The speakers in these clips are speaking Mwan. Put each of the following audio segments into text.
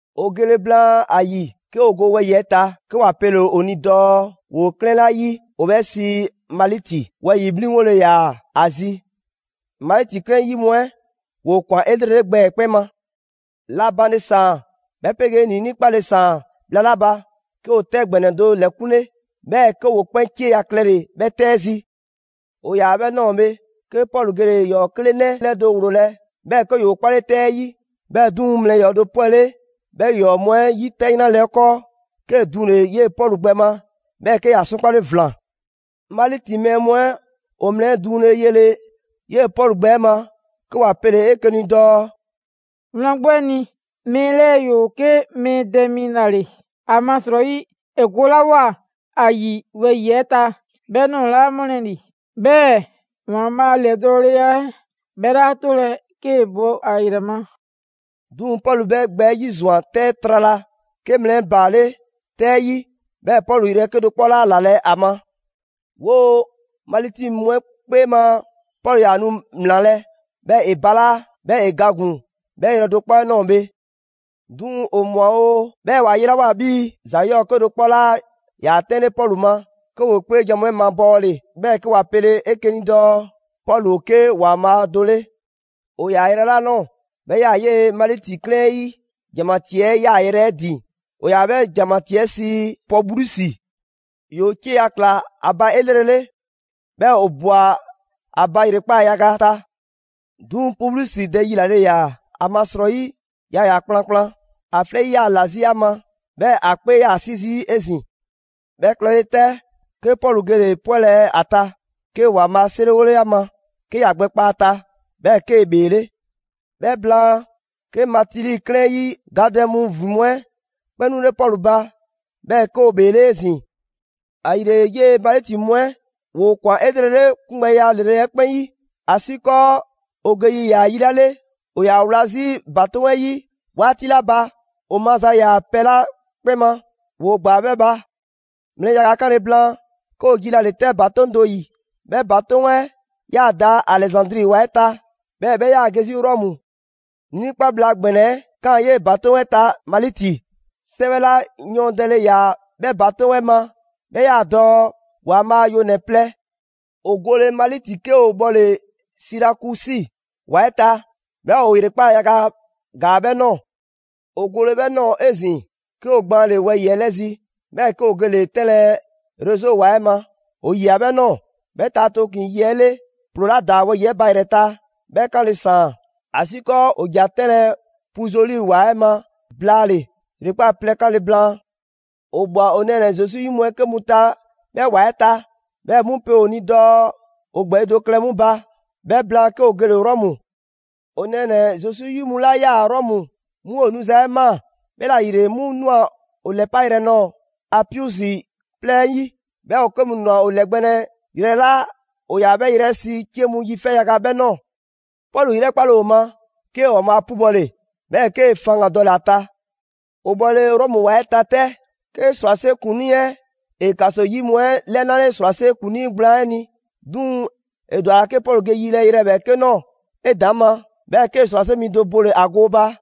'O gole blaan ‑a ‑yi, 'ke 'o go wɛyi‑ 'ɛ ta, 'ke 'wa pele‑ 'o ni dɔɔ 'woo 'klɛɛn 'la 'yi, ‑o 'bhɛ sii Maliti; wɛyi‑ 'mliŋgole ‑yaa ‑a zi. Maliti 'klɛɛn 'ɛ 'yi mu 'ɛ ‑woo' ꞊kwan 'elrele gbɛ 'ɛ 'kpɛn ma. La banle ‑saan 'bhɛ 'pegee ‑niinii' 'kpale‑ ‑saan bhla 'la ba, 'ke ‑o 'tɛ ‑gbɛnɛ do ‑lɛkunle, 'bhɛɛ‑ 'ke ‑woo' 'kpɛn 'cieya‑ klɛle‑ 'bhɛ 'tɛ 'ɛ zi. 'O 'yaa‑ 'bhɛ ꞊nɔɔ bhe, 'ke Pɔlu gele‑ ‑yɔɔ 'klenɛ 'lɛdo‑ 'wloolɛ‑, 'bhɛɛ‑ 'ke ‑yoo 'klale 'tɛ 'ɛ 'yi. 'Bhɛɛ‑ 'duŋ‑, mlɛ ‑yɔɔ' do 'pwɛle 'bhɛ ‑yɔɔ mu 'ɛ 'yi 'tɛ 'yranle‑ 'ɛ 'kɔɔ, 'kee‑ duŋle‑ 'yee‑ Pɔlu gbɛ 'ɛ ma, 'bhɛɛ‑ 'ke ‑ya 'sɔnkpale ‑vlan. Maliti mɛɛ mu 'ɛ ‑o mlɛ 'ɛ duŋle yele 'yee‑ Pɔlu gbɛ 'ɛ ma, 'ke ‑wa pele‑ 'eke‑ ni dɔɔ: «Wlan 'gbu 'ɛ ni, mɛɛ 'lɛɛ‑ ‑yoo 'ke mɛɛ dɛ mi ‑la ‑le. ‑Amasrɔyi, ‑e golawoa ‑a ‑yi wɛyi‑ 'ɛ ta, 'bhɛ ꞊nɔɔ 'laa ‑mɔlɛ' ‑li, 'bhɛɛ‑, ‑Waanbhaa' a ‑lɛdɔɔleya 'ɛ 'bhɛ 'laa 'tolɛ‑ 'kee‑ bo ‑a ‑yrɛ ma.» 'Duŋ‑, Pɔlu 'bhɛ gbɛ ‑yizwan 'tɛ 'ɛ trala, 'ke mlɛ 'ɛ baale' 'tɛ 'ɛ 'yi 'bhɛɛ‑ Pɔlu yrɛ 'kedo‑ 'kpɔ 'laa 'lalɛ‑ ‑a ma. 'Woo‑ Maliti mu 'ɛ 'kpee ma, Pɔlu ‑yaa nu ‑mlaanlɛ', 'bhɛɛ‑ ‑e balaa', 'bhɛɛ‑ ‑e ga ‑gun 'bhɛ yrɛ do 'kpɔ 'ɛ ꞊nɔɔ bhe. 'Duŋ‑ ‑o ꞊mwa oo, 'bhɛɛ‑ ‑wa yelawoa 'bhii‑ ‑za 'yɔɔ‑ 'kedo‑ 'kpɔ 'laa ‑yaa 'tɛnle Pɔlu ma, 'ke ‑woo 'kpeejan‑ mu 'ɛ mabɔɔle, 'bhɛɛ‑ 'ke ‑wa pele‑ 'eke‑ ni dɔɔ Pɔlu ‑o 'ke ‑waanbhaa' do 'le. 'O 'yaa‑ yrɛ 'la ꞊nɔɔ, 'bhɛ 'yaa‑ 'yee‑ Maliti 'klɛɛn 'ɛ 'yi ‑janmatii 'ɛ 'yaayrɛ‑ 'ɛ ‑din, ‑o ‑yaa 'bhɛ ‑janmatii 'ɛ sii Publiusi. ‑Yoo' 'cieya‑ ꞊kla ‑a ba 'elrele, 'bhɛɛ‑ 'o ꞊bwa ‑a ba ‑yrekpaa' yaga ta. 'Duŋ‑ Publiusi dɛ 'yilale ‑yaa, ‑amasrɔyi yaa ‑yaa kplankplan: ‑a 'flɛ 'yi 'yaa‑ ‑la 'zi ‑a ma, 'bhɛɛ‑ ‑a 'kpee 'yaa‑ 'si zii' 'ezin‑. 'Bhɛ klɛle 'tɛ, 'ke Pɔlu gele‑ 'pwɛlɛ‑ ‑a ta, 'kee‑ ‑Waanbhaa' 'seriwole a ma, 'ke ‑ya gbɛ kpa a ta. 'Bhɛɛ‑ 'kee‑ ‑bheele'. 'Bhɛ blaan, 'ke Maliti 'klɛɛn 'ɛ 'yi gadɛ mu ‑vin mu 'ɛ 'kpɛn 'nule Pɔlu ba, 'bhɛɛ‑ 'ke ‑o ‑bheele' 'ezin‑. ‑Ayile, 'yee‑ Maliti mu 'ɛ ‑woo' 'o ꞊kwan 'elrele 'kungbɛya ‑lrele' 'ɛ 'kpɛn 'yi. ‑Asiikɔɔ 'o ge yi ‑yaa yi 'la 'le, 'o 'yaa‑ wla 'zi ‑batoŋ' 'ɛ 'yi 'waati 'la ba, 'o maza ‑yaa pɛ 'la 'kpɛn ma, ‑woo' ‑gbaa 'bhɛ ba. Mlɛ yaga 'kanle‑ blaan, 'ke 'o jilale 'tɛ ‑batoŋ' do 'yi. 'Bhɛ ‑batoŋ' 'ɛ 'yaa‑ da Alɛzandri ‑wa 'ɛ ta, 'bhɛɛ‑ 'bhɛ 'yaa‑ ge 'zi Rɔmu; ‑niinii' 'kpa bhla ‑gbɛnɛ 'ɛ ꞊kaan 'yee‑ ‑batoŋ' 'ɛ ta Maliti. 'Sɛwɛ 'la yɔɔndɛle ‑yaa 'bhɛ ‑batoŋ' 'ɛ ma 'bhɛ 'yaa dɔɔ: «‑waanbhaa' yonɛ‑ plɛ.» 'O gole Maliti 'ke 'o 'bhɔle Sirakusi ‑wa 'ɛ ta, 'bhɛɛ‑ 'o ‑yrekpaa' yaga ‑gaa 'bhɛ ꞊nɔɔ. 'O gole 'bhɛ ꞊nɔɔ bhe 'ezin‑, 'ke 'o gbaanle‑ wɛyi‑ 'ɛ 'lɛ zi, 'bhɛɛ‑ 'ke 'o gele‑ 'tɛnlɛ‑ Rezo ‑wa 'ɛ ma, 'o ꞊yia 'bhɛ ꞊nɔɔ. 'Bhɛ ta tooklin‑ yi 'ɛ 'le, ‑ploo 'la da wɛyi‑ 'ɛ ba ‑yrɛ ta, 'bhɛ 'kanle‑ ‑saan. ‑Asiikɔɔ 'o ‑ja 'tɛnlɛ‑ Puzoli ‑wa 'ɛ ma blaale‑ ‑yrekpaa' plɛ 'kanle‑ blaan. 'O ꞊bhwa 'o nɛɛnɛ‑ Zesu 'yi mu 'ke mu ta 'bhɛ ‑wa 'ɛ ta, 'bhɛɛ‑ 'mu pe 'o ni dɔɔ 'o ‑gbɛɛyi' do klɛ 'mu ba. 'Bhɛ blaan, 'ke 'o gele‑ Rɔmu. 'O nɛɛnɛ‑ Zesu 'yi mu 'la 'yaa‑ Rɔmu, 'mu 'o 'nuza‑ 'ɛ ꞊maa. 'Bhɛla‑ ‑yile, 'mu ꞊nwa 'o 'lɛpa yrɛ nɔɔ‑ Apiusi 'plɛɛ 'ɛ 'yi, 'bhɛɛ‑ ‑o 'ke mu ꞊nwa 'o 'lɛgbɛnlɛ yrɛ 'la ‑o ‑yaa 'bhɛ yrɛ 'ɛ sii «'Cie mu yi 'fɛ yaga» 'bhɛ ꞊nɔɔ. Pɔlu 'yrɛkpale ‑o ma, 'kee‑ ‑Waanbhaa' 'pubɔle, 'bhɛɛ‑ 'ke faŋgan‑ dɔle‑ ‑a ta. 'O 'bhɔle‑ Rɔmu ‑wa 'ɛ ta 'tɛ, ('ke ‑srwase' ‑kuŋlii 'ɛ ‑e ‑kaso 'yi mu 'ɛ ‑lɛnale ‑srwase' ‑kuŋlii gblaan 'ɛ ni). 'Duŋ‑ ‑e ‑dwa ‑a ‑la 'ke Pɔlu ge yilɛ yrɛ ‑bhɛɛke' do nɔɔ‑ 'edaŋma, 'bhɛɛ‑ 'ke ‑srwase' mi do bole‑ ‑a gooba.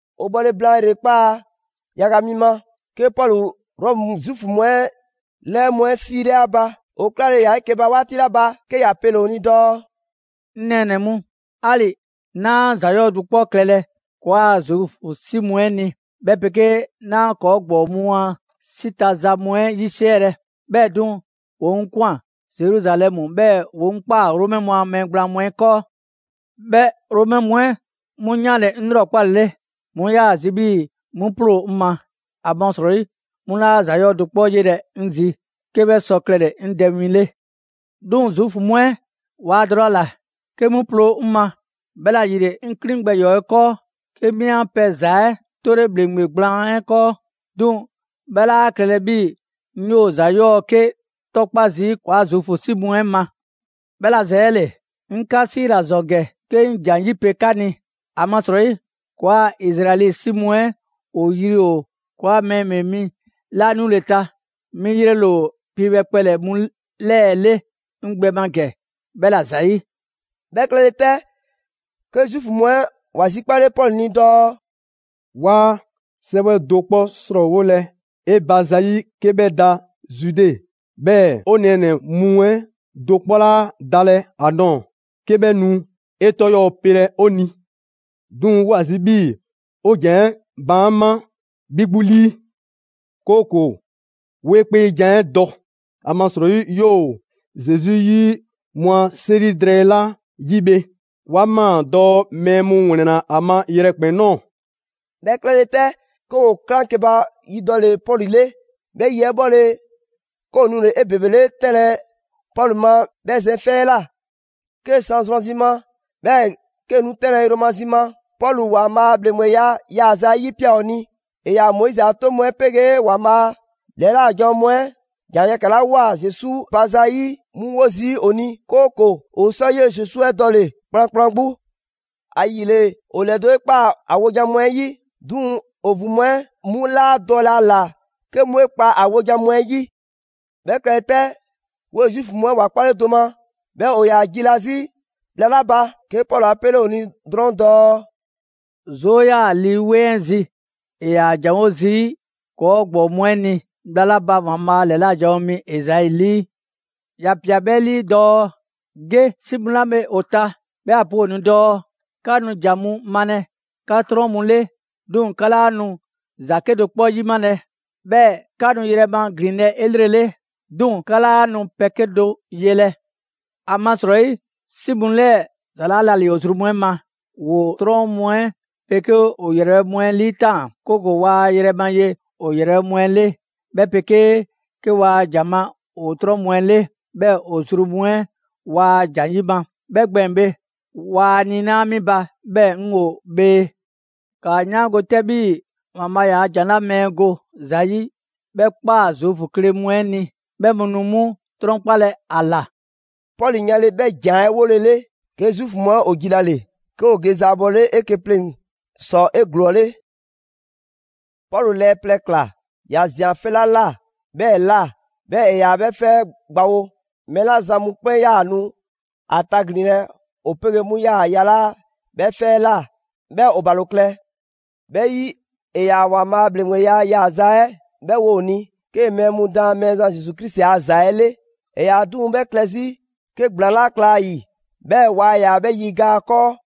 'O 'bhɔle‑ blaan ‑yrekpaa' yaga mi ma, 'ke Pɔlu Rɔmu Zuufu mu 'ɛ 'lɛɛ mu 'ɛ 'siile ‑a ba. ‑O 'klale‑ ‑yaa 'eke‑ ba 'waati 'la ba, 'ke ‑ya pele‑ ‑o ni dɔɔ: «'Ŋ nɛɛnɛ‑ mu, 'ali‑ 'naa ‑za 'yɔɔ‑ do 'kpɔ klɛlɛ ‑kɔɔa' Zuufu 'si mu 'ɛ ni, 'bhɛ 'pegee 'naa ‑kɔɔ' ‑gbɔɔ mu a 'si ta za mu 'ɛ 'yisiɛlɛ, 'bhɛɛ‑ 'duŋ‑, ‑woo' 'ŋ ꞊kwan Zeruzalɛmu, 'bhɛɛ‑ ‑woo' 'ŋ ꞊kpaa Romɛ mu a mɛɛ gblaan mu 'ɛ 'kɔɔ. 'Bhɛ Romɛ mu 'ɛ 'mu 'yanle‑ 'ŋ 'lrɔkpalele, 'mu 'yaa‑ zi 'bhii‑ 'mu 'ploo‑ 'ŋ ma, ‑amasrɔyi 'mu 'laa ‑za 'yɔɔ‑ do 'kpɔ 'yelɛ‑ 'ŋ zi 'ke 'bhɛ sɔ klɛle‑ 'ŋ dɛ win 'le. 'Duŋ‑ Zuufu mu 'ɛ waa dɔlɛ ‑a ‑la 'ke 'mu ploo 'ŋ ma, 'bhɛla‑ ‑yile, 'ŋ 'klin gbɛ ‑yɔɔ' 'ɛ 'kɔɔ, 'ke 'mi 'an pɛ ‑za 'ɛ 'tole ‑bhleŋgbe gblaan 'ɛ 'kɔɔ. 'Duŋ‑ 'bhɛ 'laa klɛlɛ 'bhii‑ 'ŋ 'yoo‑ ‑za 'yɔɔ‑ 'ke 'tɔkpa zii' ‑kɔɔa' Zuufu 'si mu 'ɛ ma. 'Bhɛla‑ ‑zɛɛle, 'ŋ 'ka 'siila‑ ‑zɔn ‑gɛ 'ke 'ŋ ‑jan 'yipe‑ 'ka ni. ‑Amasrɔyi ‑kɔɔa' Izraɛli 'si mu 'ɛ ‑o ‑yri ‑o ‑kɔɔa' Mɛɛ 'Bhee Mi 'la 'nule‑ ta, 'mi 'yrele‑ ‑o piibhɛ kpɛlɛ‑ mu 'lɛɛ‑ 'le 'ŋ gbɛ ma ‑gɛ 'bhɛla‑ ‑zayi'.» 'Bhɛ klɛle 'tɛ, 'ke Zuufu mu 'ɛ ‑wa zikpale Pɔlu ni dɔɔ: «'Waa 'sɛwɛ do 'kpɔ 'srɔɔwolɛ 'e ba zayi' 'ke 'bhɛ da Zude. 'Bhɛɛ‑ 'o nɛɛnɛ‑ mu 'ɛ do 'kpɔ 'laa dalɛ ‑a nɔɔ‑, 'ke 'bhɛ nu 'e 'tɔ ‑yɔɔ' pelɛ 'o ni. 'Duŋ‑ 'woo ‑a zi 'bhii‑ 'o ‑jan 'ɛ baan' 'ma 'bhi 'gbu 'lii, 'kooko‑ 'wo 'e 'kpeejan‑ 'ɛ dɔ. ‑Amasrɔyi 'yoo‑ Zesu 'yi mu a 'seri drɛɛ 'la 'yi bhe, 'wa ꞊maa dɔɔ mɛɛ mu ‑wlɛnna ‑a ma yrɛkpɛn‑ ꞊nɔɔ.» 'Bhɛ klɛle 'tɛ, 'ke ‑woo 'klaŋkeba yi dɔle‑ Pɔlu 'le. 'Bhɛ yi 'ɛ 'bhɔle‑, 'ke ‑o nule‑ 'ebebele 'tɛnlɛ‑ Pɔlu ma 'bhɛ zɛn 'fɛ 'ɛ ꞊la. 'Kee‑ san zrwanzi ma, 'bhɛɛ‑ 'kee‑ nu 'tɛnlɛ‑ yromazi ma, Pɔlu ‑Waanbhaa' a ‑bhleŋgbeya yaaza 'ɛ 'yipia꞊ ‑o ni. ‑E ‑yaa Moizi a 'toŋ mu 'ɛ 'pegee ‑Waanbhaa' ‑lɛla' janwo mu 'ɛ ‑jan yɛkɛ‑ 'la ꞊woa Zesu ba zayi' 'mu 'wo zii' ‑o ni, 'kooko‑ ‑o sɔ 'yee‑ Zesu 'ɛ dɔle‑ kplankplan 'gbu. ‑Ayile, ‑o ‑lɛdo' 'e ꞊kpaa ‑a wojan mu 'ɛ 'yi, 'duŋ‑ ‑o ‑vin mu 'ɛ 'mu 'laa dɔlɛ ‑a ‑la 'ke 'mu 'e kpa ‑a wojan mu 'ɛ 'yi. 'Bhɛ klɛle 'tɛ, 'woo‑ Zuufu mu 'ɛ waa 'kpalɛ‑ do ma, 'bhɛɛ‑ ‑o ‑yaa jila 'zi bhla 'la ba, 'ke Pɔlu 'a 'pele ‑o ni drɔŋ dɔɔ: «'Zoo 'yaa‑ Lii 'Weŋ 'ɛ zi ‑e ‑yaa ‑janwo' zii' 'ka ‑gbɔɔ mu 'ɛ ni bhla 'la ba ‑Waanbhaa' ‑lɛla' janwo mi Ezai 'lii! ‑Ya ꞊pia 'bhɛ 'lii dɔɔ: ‹Ge 'si mu 'la bhe ‑o ta, 'bhɛɛ‑ ‑a pe ‑o ni dɔɔ: 'Ka nu ‑jan mu malɛ 'ka 'trɔn mu 'le, 'duŋ‑ 'ka 'laa nu ‑za 'kedo‑ 'kpɔ 'yimalɛ. 'Bhɛɛ‑ 'ka nu yrɛ ma ‑glinlɛ' 'elrele, 'duŋ‑ 'ka 'laa nu pɛ 'kedo‑ 'yelɛ‑. ‑Amasrɔyi 'si mu 'lɛɛ‑ ‑za 'laa ‑la ‑li ‑o zru mu 'ɛ ma; ‑Woo 'trɔn mu 'ɛ 'pegee ‑o ‑yrɛ mu 'ɛ 'liitaan‑; 'kooko‑ waa yrɛ ma ye ‑o ‑yrɛbhɛ' mu 'ɛ 'le, 'bhɛ 'pegee 'ke waa ‑jan ma ‑o 'trɔn mu 'ɛ 'le, 'bhɛɛ‑ ‑o zru mu 'ɛ waa ‑jan 'yima‑. 'Bhɛ gbɛɛn‑ bhe, waa niinaa' 'mi ba, 'bhɛɛ‑ 'ŋ ‑o bhee.› «‑Kaa 'yaango‑ 'tɛ 'bhii‑ ‑Waanbhaa' ‑yaa' ‑jan 'la mɛɛ go ‑za 'yi 'bhɛ ꞊kpaa Zuufu kle mu 'ɛ ni. 'Bhɛ mu nu 'mu 'trɔnkpalɛ ‑a ‑la!» [Pɔlu 'yanle‑ 'bhɛ ‑jan 'ɛ 'wolele, 'ke Zuufu mu 'ɛ ‑o jilale, 'ke ‑o ge zaabɔlele 'eke‑ pleŋ‑ ‑sɔ 'eglɔɔle.] Pɔlu lɛɛ plɛ ꞊kla ‑ya ꞊zian 'fɛ 'la ꞊la 'bhɛɛ‑ ꞊la, 'bhɛɛ‑ ‑e ‑yaa 'bhɛ 'fɛ 'ɛ gbawo. Mɛɛ 'la zan mu 'kpɛn 'yaa‑ nu ‑a taglinlɛ, ‑o 'pegee 'mu 'yaa‑ yalaa' 'bhɛ 'fɛ 'ɛ ꞊la, 'bhɛɛ‑ ‑o ‑balo klɛ. 'Bhɛ 'yi, ‑e ‑yaa ‑Waanbhaa' a ‑bhleŋgbeya yaaza 'ɛ 'bhɛ wo ‑o ni, 'kee‑ mɛɛ mu daan Mɛɛzan Zesu Krisi a ‑za 'ɛ 'le. ‑E ‑yaa 'duŋ‑ 'bhɛ klɛ 'zi 'ke ‑gblaan 'laa kla ‑a ‑yi, 'bhɛɛ‑ waa ‑yaa 'bhɛ 'yiga‑ ‑a 'kɔɔ.